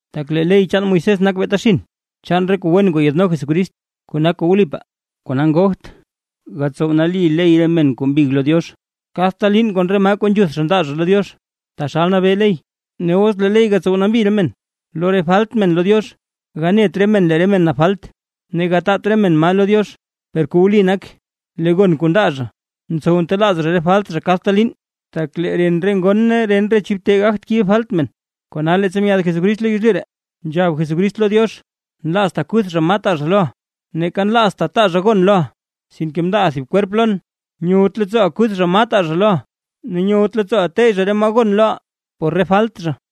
Tak lee ley chaan Moisés nak beeta xinn, chaan re kuu wen kuu yaadno Jesucrist kuu nak kuu wlipaa. Kona ngogt gatsow nali ley re men kuu mbig lo Diox kadta liin kon re maa kuu nzhuth zha ndaa lo Diox, taxal nabee ley. Ne os lee ley gatsow nambi re men lo re falt men lo Diox, ganet re men lee re men nap falt, ne gataat re men maa lo Diox. Per kuu wli nak, lee gon kuu ndaa zha ntsow ntelaaz zha re falt zha kadta liin, tak lee ren re ngon ne ren re chib te gagt kibe falt men. Kona leettsa myaad Jesucrist yezlyu ree, nzhab Jesucrist lo Diox: Nlaazta kuth zha maa taa zha loʼa, neeka nlaazta taa zha gon loʼa, sinke mndaaʼa thib kwerp lon. Nyowt leettsooʼa kuth zha maa taa zha loʼa, ne nyowt leettsooʼa teyy zha re maa gon loʼa por re falt zha.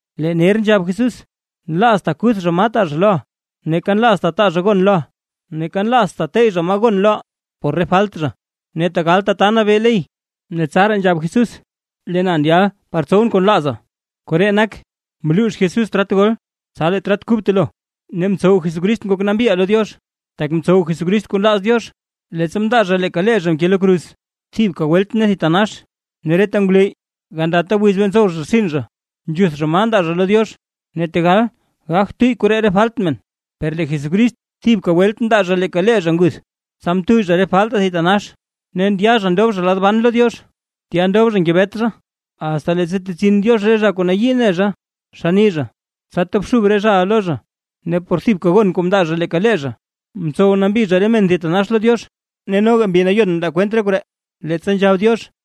Lee ner nzhab Jesús: “Nlaazta kuth zha maa taa zha loʼa, neeka nlaazta taa zha gon loʼa, neeka nlaazta tey zha maa gon loʼa por re falt zha”, ne tegal tata nabee ley. Tsaraa nzhab Jesús: “Lee na ndyal par tsowʼn kuu nlaaza”, koree nak, mluux Jesús trat gol, tsa lee trat kub telo. Ne mtsow Jesucrist ngok nambiʼaa lo Diox, tak mtsow Jesucrist kuu nlaaz Diox, leettsa mndaa zha leeka lee zha mke lo kruz thibka welt ne thitanax. Ne reta ngwleyy, gandata wiz bee ntsow zha rtsin zha, nzhuth zha maa nda zha lo Diox, ne tegal gagt tuyy koree re falt men. Per lee Jesucrist thibka welt mndaa zha leeka lee zha nguth, tsa mtuyy zha re faltaa thitanax, ne ndya zha ndob zha lad ban lo Diox. Tya ndob zha ngebet zha, asta leettsa tetsin Diox re zha kuu nayii ne zha xann nii zha, tsa tobxub re zhaʼa lo zha. Ne por thibka gon kuu mndaa zha leeka lee zha, mtsow nambi zha re men thitanax lo Diox. Ne noga Mbi Nayon mndaa kwent re koree, leettsa nzhab Diox: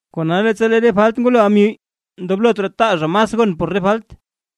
Kona leettsa lee re falt ngwaloʼa myuy, ndoblot raa taa zha mas gon por re falt.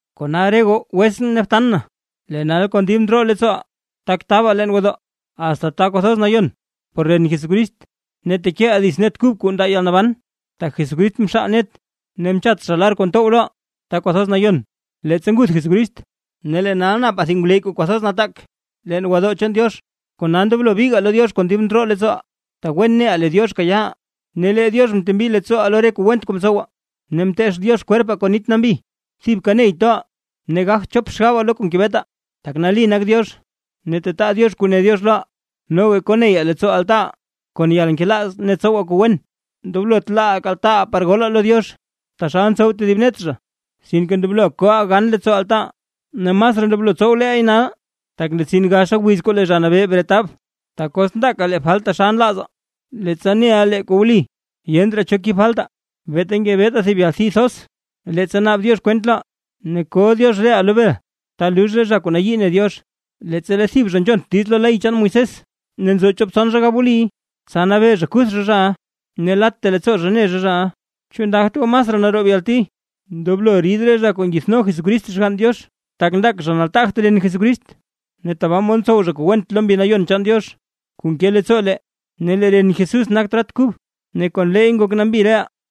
Kona re goo wetsʼn ne btan na, lee nal kon dib ndroo leettsooʼaa tak tabaa leen gwodoo, asta Ta Kwathoz Nayon por ren Jesucrist, ne tekeʼaa dits net kub kuu ndaa yalnaban. Tak Jesucrist mxaal net ne mchat zha lar kuu ntow loʼaa Ta Kwathoz Nayon, leettsa nguth Jesucrist. Ne lee nal napaa thib ngwleyy kuu kwathoz nataak leen gwodoo chaan Diox; kona ndoblo bigaa lo Diox kon dib ndroo leettsooʼaa, tak wen neʼaa lee Diox kayaaʼaa; ne lee Diox mtembi leettsooʼaa lo re kuu went kuu mtsowaa, ne mteech Diox kwerpaa kon nit nambi. Thibka ney toʼaa ne gagt chop xgabaa lo kuu ngebetaa, tak nali nak Diox ne tetaa Diox kuu ne Diox loʼaa. Noga ndoblo koneyaa leettsoo altaaʼaa kon yalnkelaaz ne tsowaa kuu wen. Ndoblot laaʼaa kaltaataa par golaa lo Diox, taxal ntsow tedib net zha, sinke ndoblo koʼaa gan leettsoo altaaʼaa, ne masraa ndoblo tsow leey nal, tak ndetsin gaxa wiz kuu lee Zha Nabee bretab. Tak os ndaaka lee falt taxal nlaazaa, leettsa neʼaa lee kuu wli, yent raa cho kib faltaa; beeta ngebetaa thib yalti thoz leettsa naab Diox kwent loʼaa, ne ko Diox reʼaa lo bel ta lux re zha kuu nayii ne Diox. Leettsa lee thib zha nzhont diiz lo ley chaan Moisés, ne nzo chop tson zha gab wliy, tsa nabee zha kuth zha zhaʼa ne latta leettsoo zha ne zha zhaʼa. ¿Chu ndagt goo masraa naroob yalti ndoblo rid re zha kuu ngithno Jesucrist Xgann Diox, tak ndak zha nataagt ren Jesucrist, ne tabaa mod ntsow zha kuu went lo Mbi Nayon chaan Diox kuu nke leettsoo lee? Ne lee ren Jesús nak trat kub ne kon leey ngok nambi reʼaa.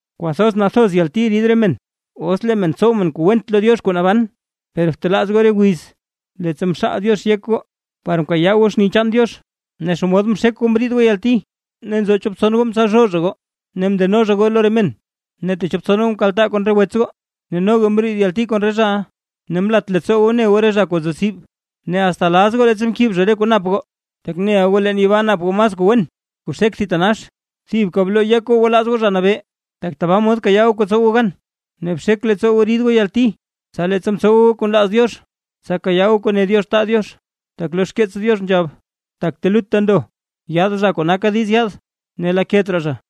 ¡Kwathoz nathoz yalti rid men, os lee men tsow men kuu went lo Diox kuu naban! Per btelaaz goo re wiz, leettsa mxaal Diox yek goo par mkayaa goo xni chaan Diox ne xomod mxek goo mriid goo yalti, nzo chop tson goo mtsalzhoo zha goo ne mndeno zha goo lo re men, ne techop tson goo mkaltaa kon re wets goo, ne no goo mriid goo yalti kon re zhaʼa. Ne mlat leettsoo goo mne goo re zha kuu nzo tsib, ne asta laz goo leettsa mkib zha re kuu nap goo, tak neʼa goo leen yibaa nap goo mas kuu wen kuu xek thitanax. Thibka bloo goo yek goo gwalaaz goo Zha Nabee, tak tabaa mod kayaa goo kuu tsow goo gan. Ne bxek leettsoo goo rid goo yalti, tsa leettsa mtsowa goo kuu nlaaz Diox, tsa kayaa goo kuu ne Diox taa Diox. Tak lo xkeets Diox nzhab: Tak telutta ndo, yaad zha kuu naka diiz yaad, ne laket raa zha.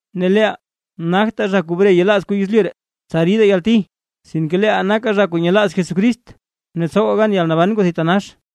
Ne leeʼaa nagtaa zha kuu bre yelaaz kuu yezlyu ree, tsa ridaa yalti, sinke leeʼaa nakaa zha kuu nyelaaz Jesucrist, ne tsowaa gan yalnaban kuu thitanax.